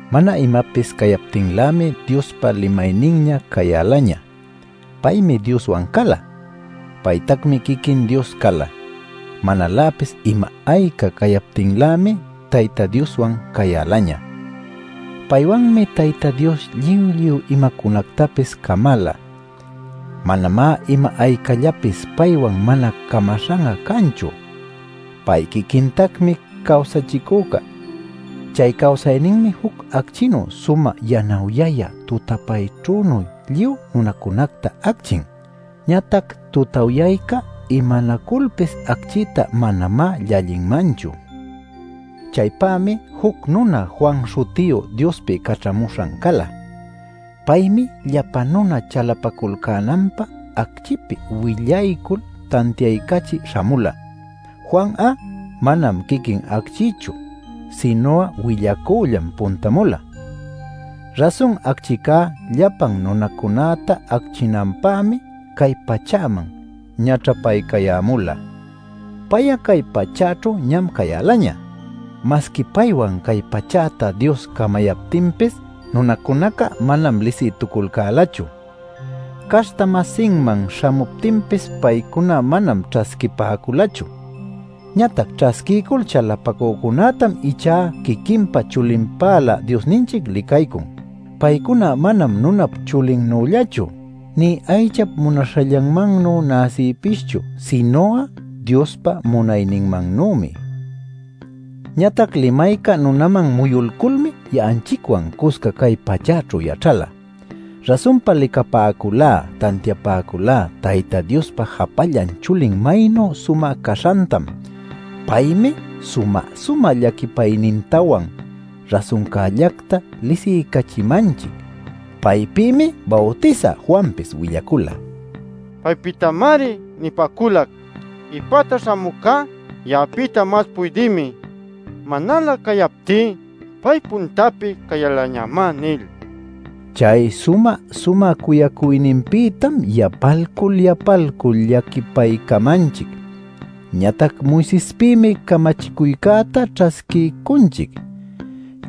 Mana imapis cayaptinlämi Diospa Limaynin ñä cayälaña. Paymi Dioswan cala; paytacmi quiquin Dios cala. Manaläpis ima ayca cayaptinlämi Tayta Dioswan cayälaña. Paywanmi Tayta Dios lluy lluy imacunactapis camala. Manamá ima aycallapis paywan mana camaśhan'a canchu. Pay quiquintacmi cawsachicüca. Chay cawsayninmi juc acchinuy sumä yanawyayä tutapäćhünuy lluy nunacunäta acchin. Ñatac tutawyayca imanaculpis acchïta manamá llallinmanchu. Chaypämi juc nuna Juan śhutiyu Diospi caćhamuśhan cala. Paymi llapa nuna chalapaculcänanpä acchïpi willaycul tantiaycachï śhamula. Juan'a manam quiquin acchïchu, sinu'a willacüllam puntamula. Rasun acchicá llapan nunacunäta acchinanpämi cay pachäman ñaćhapaycayämula. Pay'a cay pachäćhu ñam cayälaña. Masqui paywan cay pachäta Dios camayaptinpis, nunacunaca manam lisïtuculcälachu. Caśhta-masinman śhamuptinpis, paycuná manam ćhasquipäculachu. Ñatac ćhasquiycul chalapacücunätam ichá, quiquinpa chulinpälä Diosninchic licaycun. Paycuna manam nunap chulinnüllachu, nï aychap munaśhallanmannu näsïpischu, sinu'a Diospa munayninmannümi. Ñatac Limayca nunaman muyulculmi ya'anchicwan cusca cay pachäćhu yaćhala. Rasunpa licapäculá, tantiapäculá Tayta Diospa japallan chulin maynu sumä caśhantam. Paymi sumä-sumä llaquipaynintawan rasuncällacta lisiycachimanchic. Paypïmi Bawtisä Juanpis willacula: “Paypïtamari nipäculac: ‘Ipäta śhamücá ya'apïta mas puydïmi; manalä cayaptí pay puntapi cayälañamá’ nil” nin. Chay sumä-sumä cuyacuyninpïtam yapalcul yapalcul llaquipaycamanchic. Ñatac Moisespïmi camachicuycätá ćhasquiycunchic;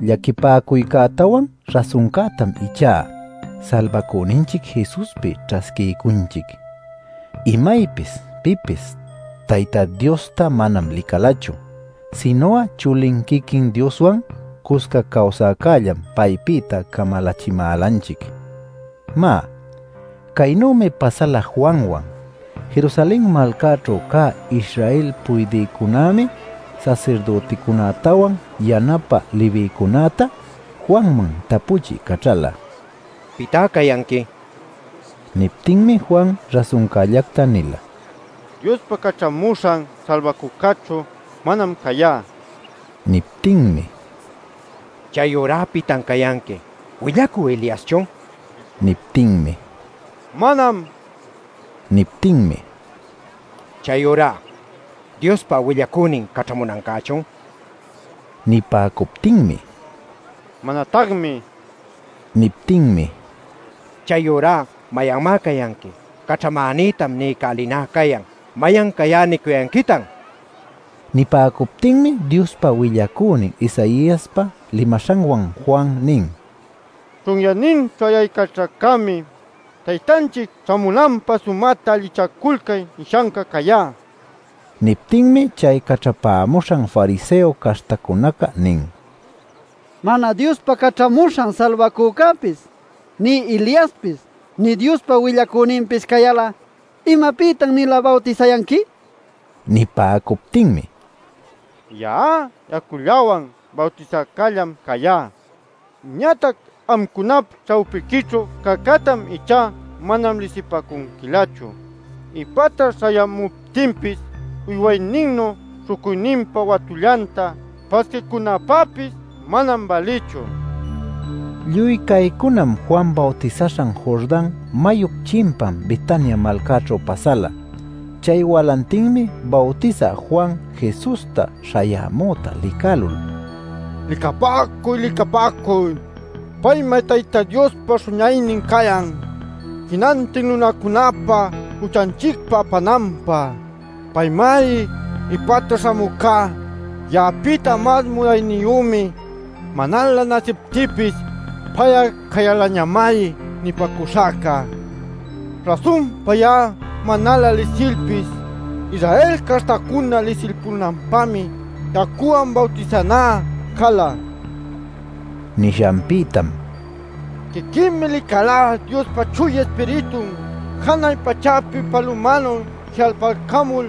llaquipäcuycätawan rasuncätam ichá Salbacüninchic Jesuspi ćhasquiycunchic. Imaypis pipis Tayta Diosta manam licalachu; sinu'a Chulin quiquin Dioswan cusca cawsäcällam paypïta camalachimälanchic. Má, caynümi pasala Juanwan: Jerusalen malcäćhu cä Israel puydïcunämi sasirdüticunätawan yanapä Levïcunäta Juanman tapuchï caćhala “¿Pitá cayanqui?” nil. Niptinmi Juan rasuncällacta nila: “Diospa Caćhamuśhan Salbacücächu manam cayá” nil. Niptinmi: “¿Chayurá pitan cayanqui? ¿Willacü Eliaschun?” nin. Niptinmi: “Manam” nin. Niptinmi: “Chayurá ¿Diospa willacünin caćhamunancächun?” nin. Nipäcuptinmi: “Manatacmi” nin. Niptinmi: “Chayurá ¿mayanmá cayanqui? Caćhamänïtam niycälinä cayan. ¿Mayan cayá nicuyanquitan?” nin. Nipäcuptinmi Diospa willacünin Isaiaspa limaśhanwan Juan nin: “Chunyäninćhu ayaycaćhäcämi ‘Taytanchic ćhämunanpä sumäta allichaculcay’ nishanca cayá” nila. Niptinmi chay caćhapämuśhan fariseo caśhtacunaca nin: “Mana Diospa Caćhamuśhan Salbacücäpis, nï Eliaspis, nï Diospa Willacüninpis cayal'a ¿imapïtan-nila bawtisayanqui?” nil. Nipäcuptinmi: “Ya'a yacullawan bawtisäcällam cayá. Ñatac amcunap ćhawpiquićhu cäcätam ichá mana lisipäcunquilächu. Ipäta śhayämuptinpis uywayninnu śhucuyninpa watullanta pasquiycunäpäpis manam bälïchu” nila. Lluy caycunam Juan bawtisaśhan Jordan mayup chimpan Betania malcaćhu pasala. Chay walantinmi Bawtisä Juan Jesusta śhayämüta licälul: “¡Licapäcuy licapäcuy! ¡Paymá Tayta Diospa Śhuñaynin cayan jinantin nunacunäpa juchanchicta apananpä! Paymari: ‘Ipäta śhamüca ya'apïta mas munayniyümi; manalä näsiptïpis pay'a cayälañamari’ nipäcuśhacca. Rasunpa ya'a manalä lisilpis, Israel caśhtacuna lisilpunanpämi yacuwan bawtisanä cala” nin. Nishanpïtam: “Quiquïmi licalá Diospa Chuya Ispiritun janay pachäpi palumanuy ji'alpalcamul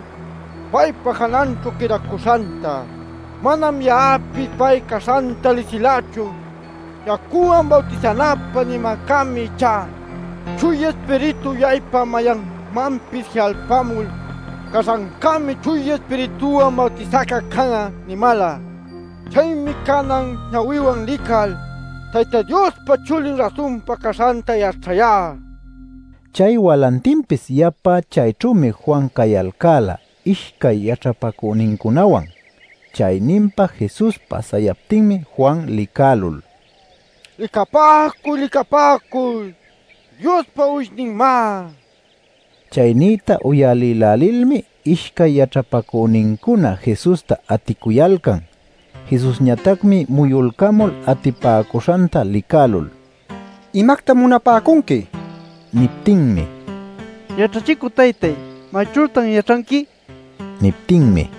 paypa jananćhu quïdacuśhanta. Manam ya'apis pay caśhanta lisilächu. Yacuwan bawtisanäpä nimäcämi ichá: ‘Chuya Ispiritu uyaypa mayanmanpis ji'alpamul caśhancämi Chuya Ispirituwan bawtisäca can'a’ nimäla. Chaymi canan ñawïwan lical Tayta Diospa Chulin rasunpa caśhanta yaćhayá” nila. Chay walantinpis yapa chayćhümi Juan cayalcäla ishcay yaćhapacünincunawan. Chayninpa Jesus pasayaptinmi Juan licälul: “¡Licapäcuy, licapäcuy! ¡Diospa uwishninmá!” nin. Chay nïta uyalïlälilmi ishcay yaćhapacünincuna, Jesusta aticuyalcan. Jesusñatacmi muyulcamul atipäcuśhanta licälul “¿Imactam munapäcunqui?” nin. Niptinmi: “¿Yaćhachicü taytay, mayćhütan yaćhanqui?” nin. Niptinmi: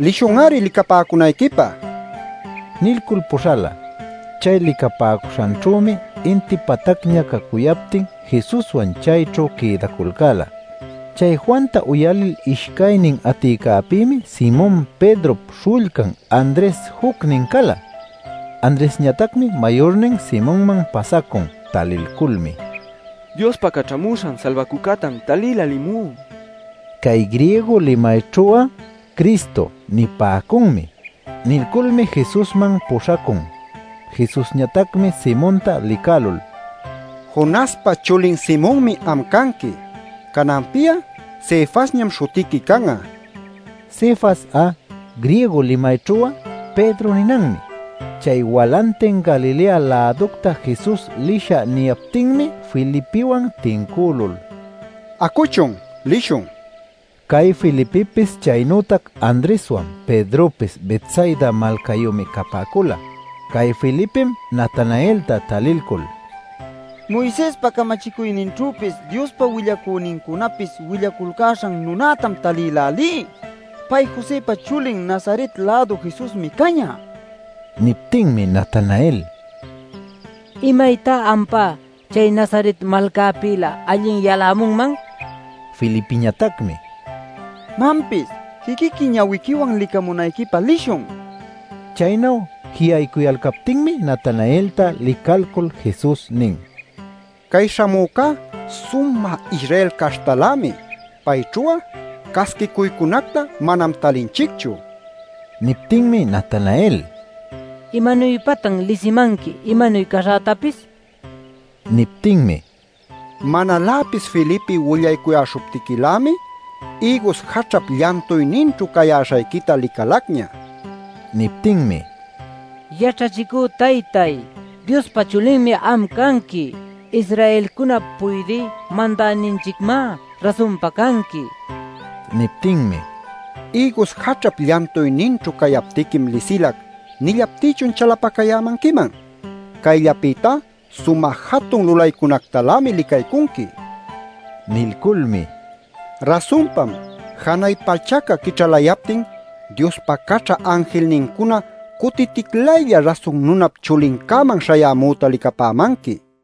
“Lishun-ari licapäcunayquipä” nilcul puśhala. Chay licapäcuśhanćhümi inti patacña cacuyaptin Jesuswan chayćhu quïdaculcäla. Chay Juanta uyalil ishcaynin aticäpïmi Simon Pedrop śhullcan Andres jucnin cala. Andresñatacmi mayurnin Simonman pasacun. Talilculmi: “Diospa Caćhamuśhan Salbacücätam talïlälimú” nin. (Cay griego limayćhu'a “Cristo” nipäcunmi.) Nilculmi Jesusman puśhacun. Jesusñatacmi Simonta licälul: “Jonaspa chulin Simonmi am canqui. Cananpi'a Cefasñam śhutiqui can'a” nin. (Cefas'a griego limayćhu'a “Pedro” ninanmi.) Chay walantin Galilea-läducta Jesus lishä niyaptinmi Felipiwan tincülul: “Acuchun, lishun” nin. Cay Felipipis chaynütac Andreswan, Pedropis Betsaida malcayümi capäcula. Cay Felipim Natanaelta talilcul: “Moisespa camachicuyninćhüpis, Diospa willacünincunapis willaculcäśhan nunätam talïlälí. Pay Josëpa chulin Nazaret-lädu Jesusmi cañä” nin. Niptinmi Natanael: “¡Imaytá ampá chay Nazaret malcapïlä allin yalämunman!” nin. Felipiñatacmi: “Manpis, quiquiqui ñawiquiwan licämunayquipä lishun” nin. Chaynu ji'aycuyalcaptinmi Natanaelta licalcul Jesus nin: “Cay śhamücá sumä Israel caśhtalämi; payćhu'a casquicuycunacta manam talinchicchu” nil. Niptinmi Natanael: “¿Imanuypatan lisimanqui imanuy caśhätapis?” nin. Niptinmi: “Manaläpis Felipe willaycuyäśhuptiquilämi, ïgus jaćhap llantuyninćhu cayäśhayquita licalacña” nin. Niptinmi: “Yaćhachicü taytáy ¡Diospa Chulinmi am canqui! ¡Israelcunap puydï mandäninchicmá rasunpa canqui!” nin. Niptinmi: “ ‘¿Ïgus jaćhap llantuyninćhu cayaptiquim lisilac’ nillaptïchun chalapacayämanquiman? Cayllapïtá sumä jatun lulaycunactalämi licaycunqui” nin. Nilculmi: “Rasunpam, janay pachaca quićhalayaptin Diospa caćha anjilnincuna cutiticlaylla Rasun Nunap Chulincäman śhayämüta licapämanqui” nilatac.